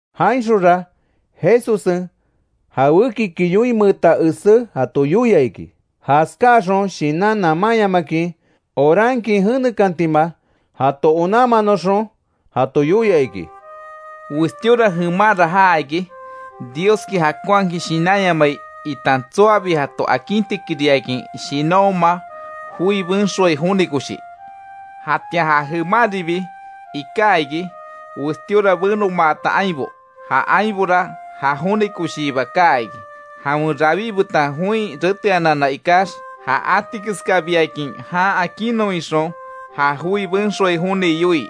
Jainxonra Jesussen, jawékiki yoinmeeta esé jato yoia iki, jaskáaxon shinan namanyamakin orankin jenekantima, jato onanmanoxon. Jato yoia iki: “Westíora jemanra jaa iki; Dioski jakonhakin shinanyamai itan tsoabi jato akintikiriakin shinanhoma joi benxoai joni koshi. Jatian ja jemanribi iká iki, westíora benomaata ainbo. Ja ainbora ja joni koshiiba kaa iki, jawen rawí betan join reteanana ikax, ja atikesbiakin jan akinnon ixon ja joi benxoai joni yoii.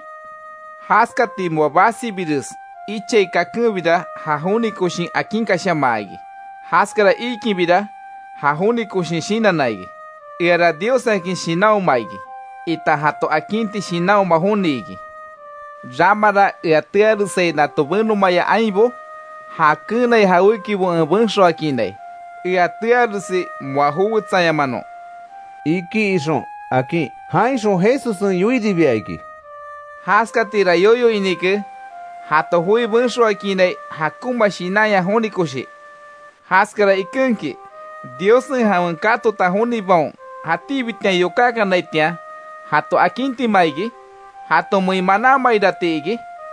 Jaskati moa basibires ichai kakenbira, ja joni koshin akinkashamaa iki. Jaskara iikinbira ja joni koshin shinanna iki: ‘Eara Dios akin shinanhoma iki, itan jato akinti shinanhoma joni iki. Ramara ea tearesai nato benomaya ainbo, ja keenai jawékibo en benxoakiinai, ea tearesi moa jowetsayamanon’”, iki ixon, akin. Jainxon Jesussen yoiribia iki: “Jaskatira yoyo inike jato joi benxoakiinai, jakonma shinanya joni koshi, Jaskara ikenki ¿Diossen jawen katota jonibaon jatíbitian yokákanaitian jato akintima iki? ¿Jatomein manámairati iki?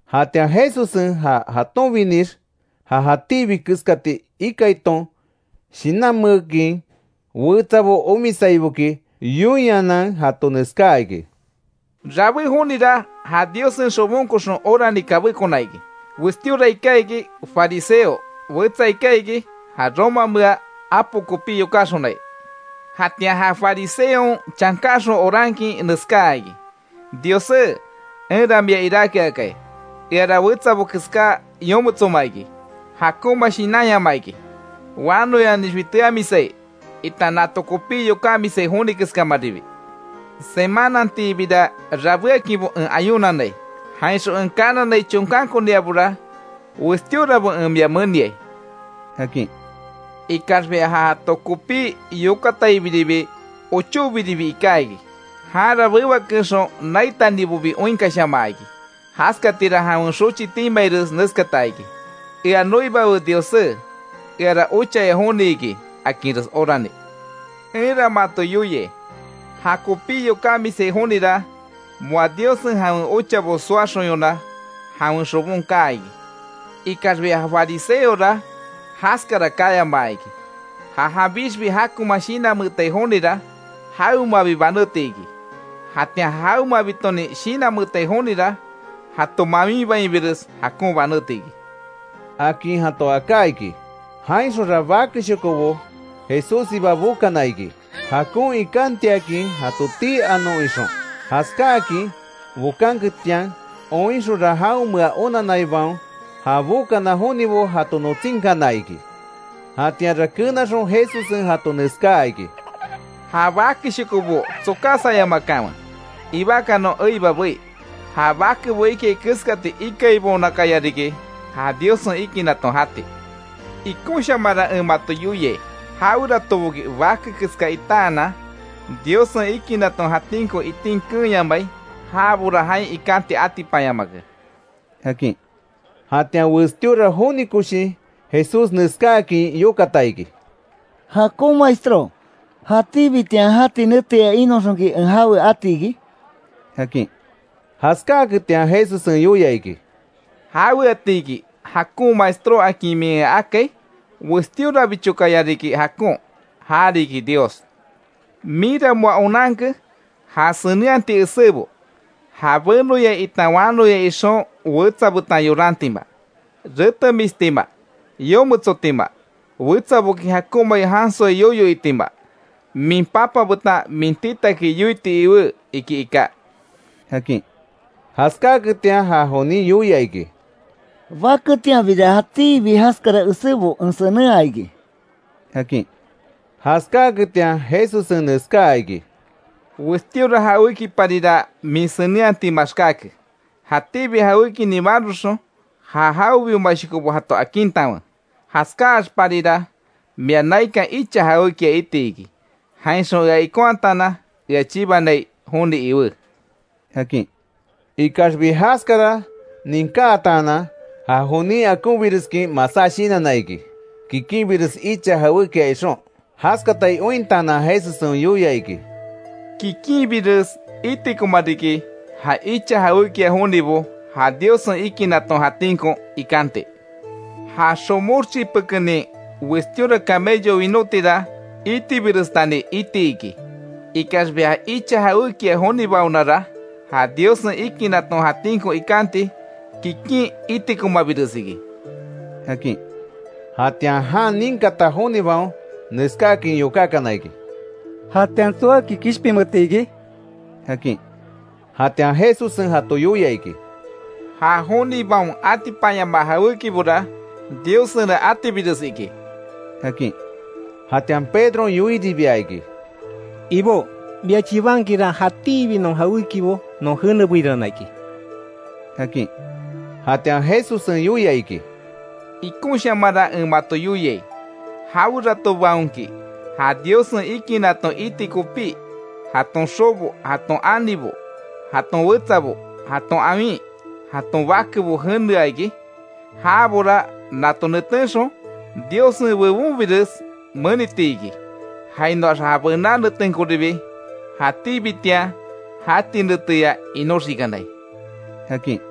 Jatian Jesussen, ja jatonbinix, ja itibi keskati ikaiton shinanmeekin, wetsabo omisaiboki yoinhanan, jato neskáa iki: “Rabé jonira ja Diossen xobonkoxon orani kabékona iki: Westíora iká iki fariseo, wetsa iká iki, ja romamea apo kopí yokáxonai. Jatian ja fariseon chankáxon orankin neskáa iki: ‘Diossé, enra mia iráke akai. Eara, wetsabo keská yometsoma iki, jakonma shinanyama iki, wanoyanixbi teamisai, itan nato kopí yokámisai joni keskámaribi. Semanantiibira rabéakinbo en ayunanai. Jainxon en kananai chonkankoniabora westíorabo en mia meniai’, akin. Ikaxbi ja jato kopí yokataibiribi, ochóbiribi iká iki. Janra bewakeexon naitanibobi oinkashamaa iki. Jaskatira jawen xochi timaires neskata iki: ‘¡Ea noibawe Diossé, eara ochaya joni iki!’ akinres orani. Enra mato yoiai, jakopí yokámisai jonira, moa Diossen jawen ochabo soaxonyona, jawen xobon kaa iki. Ikaxbi ja fariseora jaskara kayamaa iki. Ja janbixbi jakonman shinanmeetai jonira, jawemabi banéti iki. Jatian ja jawemabitonin shinanmeetai jonira, jato mawinbainbires jakon banéti iki”, akin jato aká iki. Jainxonra bakeshokobo Jesússiba bokana iki, jakon ikantiakin jato tii anon ixon. Jaskáakin bokanketian oinxonra jaonmea onanaibaon, ja bokana jonibo jato notsínkana iki. Jatianra kenaxon Jesussen jato neskáa iki: —Ja bakeshokobo tsokásayamakanwe ibakanon eiba bei. Ja bakebo ikai keskati ikaibaonakaya riki; ja Diossen ikinaton jati. Ikonshamanra en mato yoiai, jaweratoboki bake keska itaanan, Diossen ikinaton jatinko itin keenyamai, jabora jain ikanti atipanyamake —akin. Jatian westíora joni koshin Jesús neskáakin yokata iki: —Jakon Maestró ¿Jatíbitian jati neteya inoxonki en jawe ati iki? —akin. Jaskáaketian Jesussen yoia iki: —¿Jaweatiki jakon maestró akin min ea akai? Westíorabichokaya riki jakon, ja riki Dios. Minra moa onanke ja senenhati esébo. ‘Ja benoya itan wanoya ixon wetsa betan yorantima, retemistima, yometsotima, wetsaboki jakonmai jansoi yoyo itima, min papa betan min titaki yoiti iwé iki iká’ —akin. Jaskáaketian ja jonin yoia iki: —Baketianbira jatíbi jaskara esébo en senenhaa iki —akin. Jaskáaketian Jesussen neskáa iki: —Westíora jawékiparira min senenhati maxkáke. Jatíbi jawékinin maroxon, ja jawebiomashokobo jato akintanwe. Jaskáaxparira mia naikan icha jawékia iti iki. Jainxon ea ikonhataanan ea chibanai joni iwé —akin. Ikaxbi jaskara ninkátaanan ja jonin akonbireskin masá shinanna iki, kikinbires icha jawékia ixon. Jaskatai ointaanan Jesussen yoia iki: —¡Kikinbires itikoma riki ja icha jawékia jonibo, ja Diossen ikinaton jatinko ikanti! Ja xomox chipekenin westíora camello winótira itibirestani iti iki. Ikaxbi ja icha jawékia jonibaonara, ja Diossen ikinaton jatínko ikanti, kikin itikomabires iki —akin. Jatian jan ninkata jonibaon neskáakin yokákana iki: —¿Jatian tsoaki kishpinmeeti iki? —akin. Jatian Jesussen jato yoia iki: —Ja jonibaon atipanyamaa jawékibora Diossena atibires iki —akin. Jatian Pedron yoiribia iki: —Ibó, mia chibankinra jatíbi non jawékibo, non jenebeirana iki —akin. Jatian Jesussen yoia iki: —Ikonshamanra en mato yoiai, jaweratobaonki ja Diossen ikinaton iti kopí, jaton xobo, jaton anibo, jaton wetsabo, jaton awin, jaton bakebo jenea iki. Jabora nato netenxon Diossen bebonbires meniti iki, jainoax ja bená netenkoribi jatíbitian jati neteya inoxikanai —akin.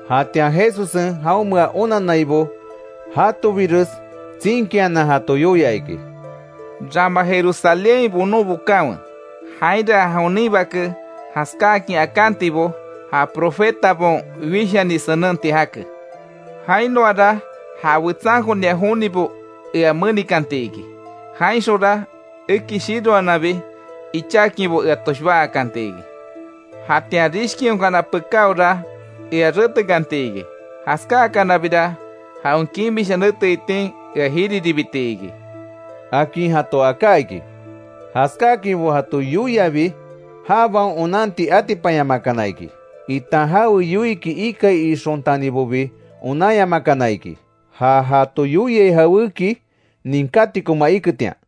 Jatian Jesussen, jaonmea onannaibo jatobires tsinkianan, jato yoia iki: “Rama Jerusalénhain bonon bokanwe; jainra ja jonin Bake jaskáakin akantibo ja profetabaon wishani senenti jake. Jainoara ja wetsankonia jonibo ea menikanti iki. Jainxonra eki shiroananbi ichákinbo, ea toshbá akanti iki. Jatian rishkihonkana pekáora ea retekanti iki. Jaskáakanabira jawen kimisha nete itin ea jiriribiti iki”, akin jato aká iki. Jaskáakinbo jato yoiabi, jabaon onanti atipanyamakana iki, itan jawe yoiiki ikai ixontanibobi onanyamakana iki. Ja jato yoiai jawéki ninkátikoma iketian.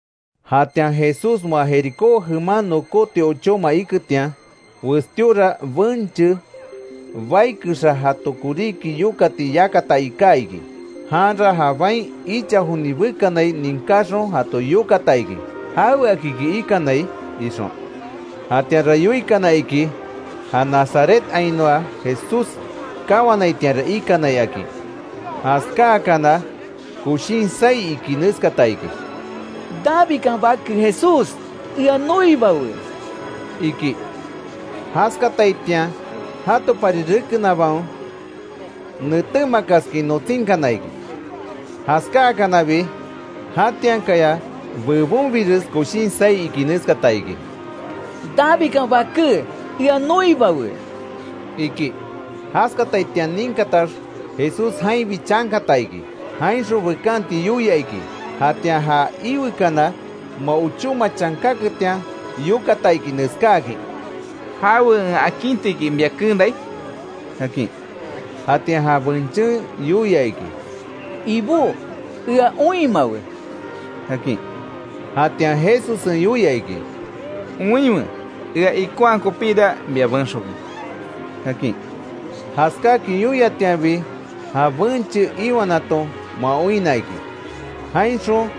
Jatian Jesús moa Jericó jeman nokóti ochóma iketian, westíora benche, bai kexa jato koríki yokati yakata iká iki. Janra ja bain icha joni bekanai ninkaxon, jato yokata iki, ¿Jaweakiki ikanai? ixon. Jatianra yoikana iki, ja Nazarethainoa Jesús kawanaitianra ikanai, akin. Jaskáakana koshin saí iki neskata iki: —¡Davidkan Bake Jesús, ea noibawe! —iki. Jaskataitian jatopari rekenabaon, netémakaskin notsínkana iki. Jaskáakanabi jatiankaya bebonbires koshin saí iki neskata iki: —¡Davidkan Baké, ea noibawe! —iki. Jaskataitian ninkatax Jesús jainbi chankata iki; jainxon bekanti yoia iki. Jatian ja iwekana moa ochóma chankaketian yokata iki, neskáakin: —¿Jawe en akintiki mia keenai? —akin. Jatian ja benchen yoia iki: —Ibó, ea oinmawe —akin Jatian Jesussen yoia iki: —¡Oinwe! Ea ikonhaa kopíra mia benxoke —akin. Jaskáakin yoiatianbi ja benche iwanaton moa oinna iki; jainxon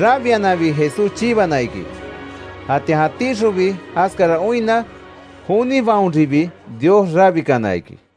rabiananbi Jesús chibana iki. Jatian jatíxonbi jaskara oinna jonibaonribi Dios rabikana iki.